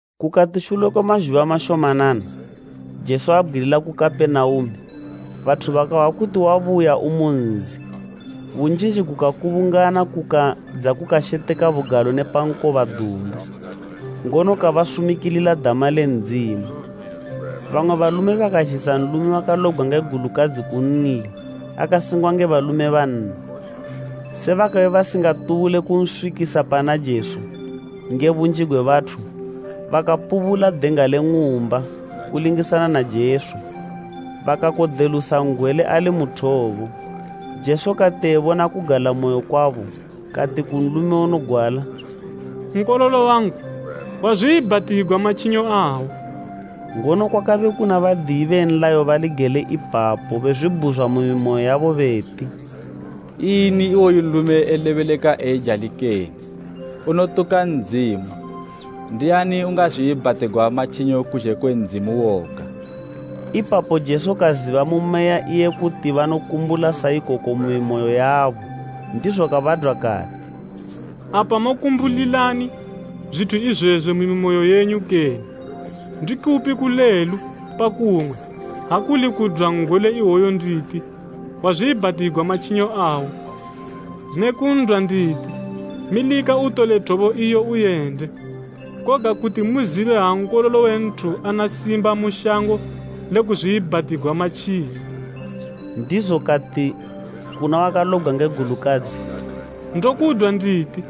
Kukati shule kwe mazhuba mashomanana, Jesu abgwilila ku Kapenaume, bathu bakahwa kuti wabuya umu nzi. Bunjinji gukakubungana, kukadza kukasheteka bugalo ne pa nkoba dumbu, ngono kabasumikilila dama le Ndzimu. Bamwe balume bakazhisa nlume wakalobgwa nge gulukadzi kunli akasengwa nge balume banna. Se bakabe basingatubule kunswikisa pana Jesu nge bunji gwe bathu, bakapubula denga le ng'umba kulingisana na Jesu, bakakodelusa n'gwele ali mu thobo. Jesu kati ebona kugalamoyo kwabo kati ku nlume unogwala, “Nkololo wangu, wazwiibhatigwa matjinyo awo.” Ngono kwakabe kuna badiyi be nlayo bali gele ipapo bezwibhuzwa mu mimoyo yabo beti, “Ini iwoyu nlume elebeleka eijali kene? Unotuka Ndzimu. Ndiani ungazwiibhatigwa matjinyo kuzhe kwe Ndzimu woga?” Ipapo Jesu kaziba mu meya iye kuti banokumbula sa ikoko mu mimoyo yabo, ndizo kabadwa kati, “Apa mokumbulilani zwithu izwezwi mu mimoyo yenyu kene? Ndikupi kulelu pa kumwe, ha kuli kudwa n'gwele iwoyu nditi ‘Wazwiibhatigwa matjinyo awo,’ ne kun'dwa nditi, ‘Milika utole thobo iyo uyende?’ Koga kuti muzibe ha Nkololo we Nthu ana simba mu shango le kuzwiibhatigwa matjinyo.” Ndizo kati kuna wakalobgwa nge gulukadzi, “Ndokudwa nditi,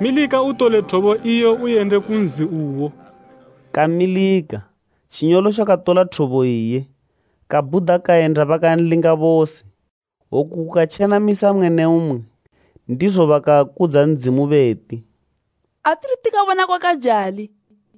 milika utole thobo iyo uyende ku nzi uwo!” Kamilika, tjinyolotjo katola thobo iye, kabhuda kayenda bakanlinga bose. Oku kukatjenamisa mmwe ne mmwe, ndizo bakakudza Ndzimu beti, “Atithu tikabona kwakajali!”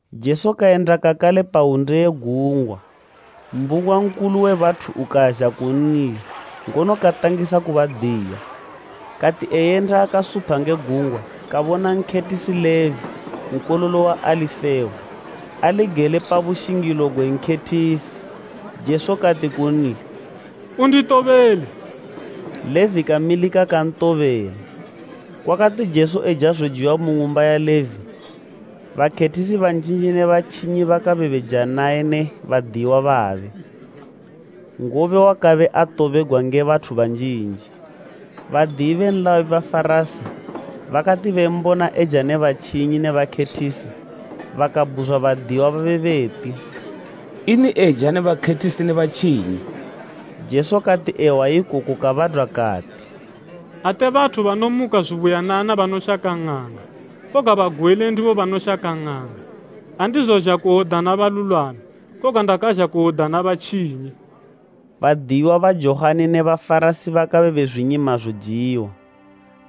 Jesu kayenda kakale pa hwunde ye gungwa. Mbunga nkulu we bathu ukazha kunli, ngono katangisa kubadiya. Kati eyenda akasupha nge gungwa, kabona nkhethisi Levi nkololo wa Alifeo ali gele pa bushingilo gwe nkhethisi. Jesu kati kunli, “Unditobele.” Levi kamilika kantobela. Kwakati Jesu eja zojiwa mu ng'umba ya Levi, bakhethisi banjinji ne batjinyi bakabe beja naye ne badiyiwa babe, ngobe wakabe atobegwa nge bathu banjinji. Badiyi be nlayo be Bafarasi bakati bembona eja ne batjinyi ne bakhethisi, bakabhuzwa badiyiwa babe beti, “Ini eja ne bakhethisi ne batjinyi?” Jesu kati ehwa ikoku kabadwa kati, “Ate bathu banomuka zubuyanana banoshaka ng'anga, koga bagwele ndibo banoshaka ng'anga. Andizozha kuwodana balulwami, koga ndakazha kuwodana batjinyi.” Badiyiwa ba Johani ne Bafarasi bakabe bezwinyima zojiwa.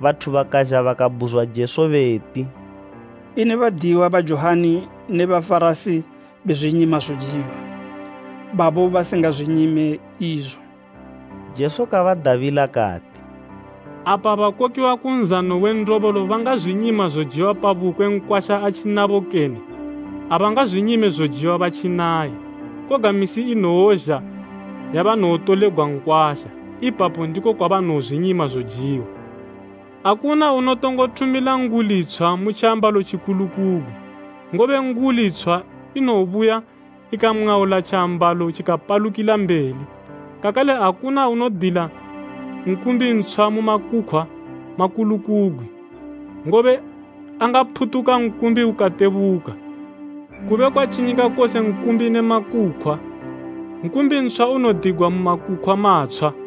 Bathu bakazha bakabhuzwa Jesu beti, “Ini badiyiwa ba Johani ne be Bafarasi bezwinyima zojiwa, babo basingazwinyime izo?” Jesu kabadabila kati, “Apa bakokiwa ku nzano we ndobolo bangazwinyima zojiwa pa bukwe nkwasha atjinabo kene? Abangazwinyime zojiwa batjinaye. Koga misi inowozha yabanowotolegwa nkwasha, ipapo ndiko kwabanowozwinyima zojiwa. “Akuna unotongo thumila nguli tshwa mu tjiambalo tjikulukugwi, ngobe nguli tshwa inowobuya, ikamwaula tjiambalo tjikapalukila mbeli. Kakale akuna unodila nkumbi ntshwa mu makukhwa makulukugwi, ngobe angaphutuka nkumbi ukatebuka, kube kwatjinyika kose nkumbi ne makukhwa. Nkumbi ntshwa unodigwa mu makukhwa matshwa.”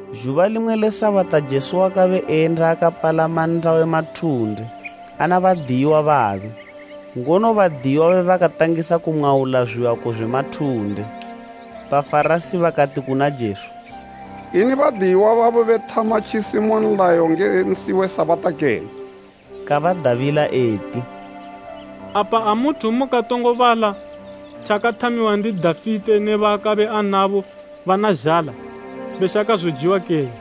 Zhuba limwe le Sabata Jesu wakabe eyenda akapalama nnda we mathunde ana badiyiwa babe, ngono badiyiwa babe bakatangisa kumwaula zwiyako zwe mathunde. Bafarasi bakati kuna Jesu, “Ini badiyiwa babo bethama tjisi mu nlayo nge nsi we Sabata kene?” Kabadabila eti, “Apa amuthu mukatongo bala tjakathamiwa ndi Dafite ne baakabe anabo bana zhala, beshaka zojiwa kene?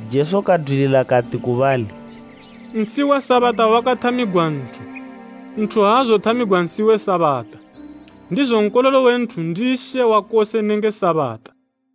Jesu kadwilila kati ku bali, “Nsi we Sabata wakathamigwa nthu, nthu aazothamigwa nsi we Sabata. Ndizo Nkololo we Nthu ndi She wa kose nenge Sabata.”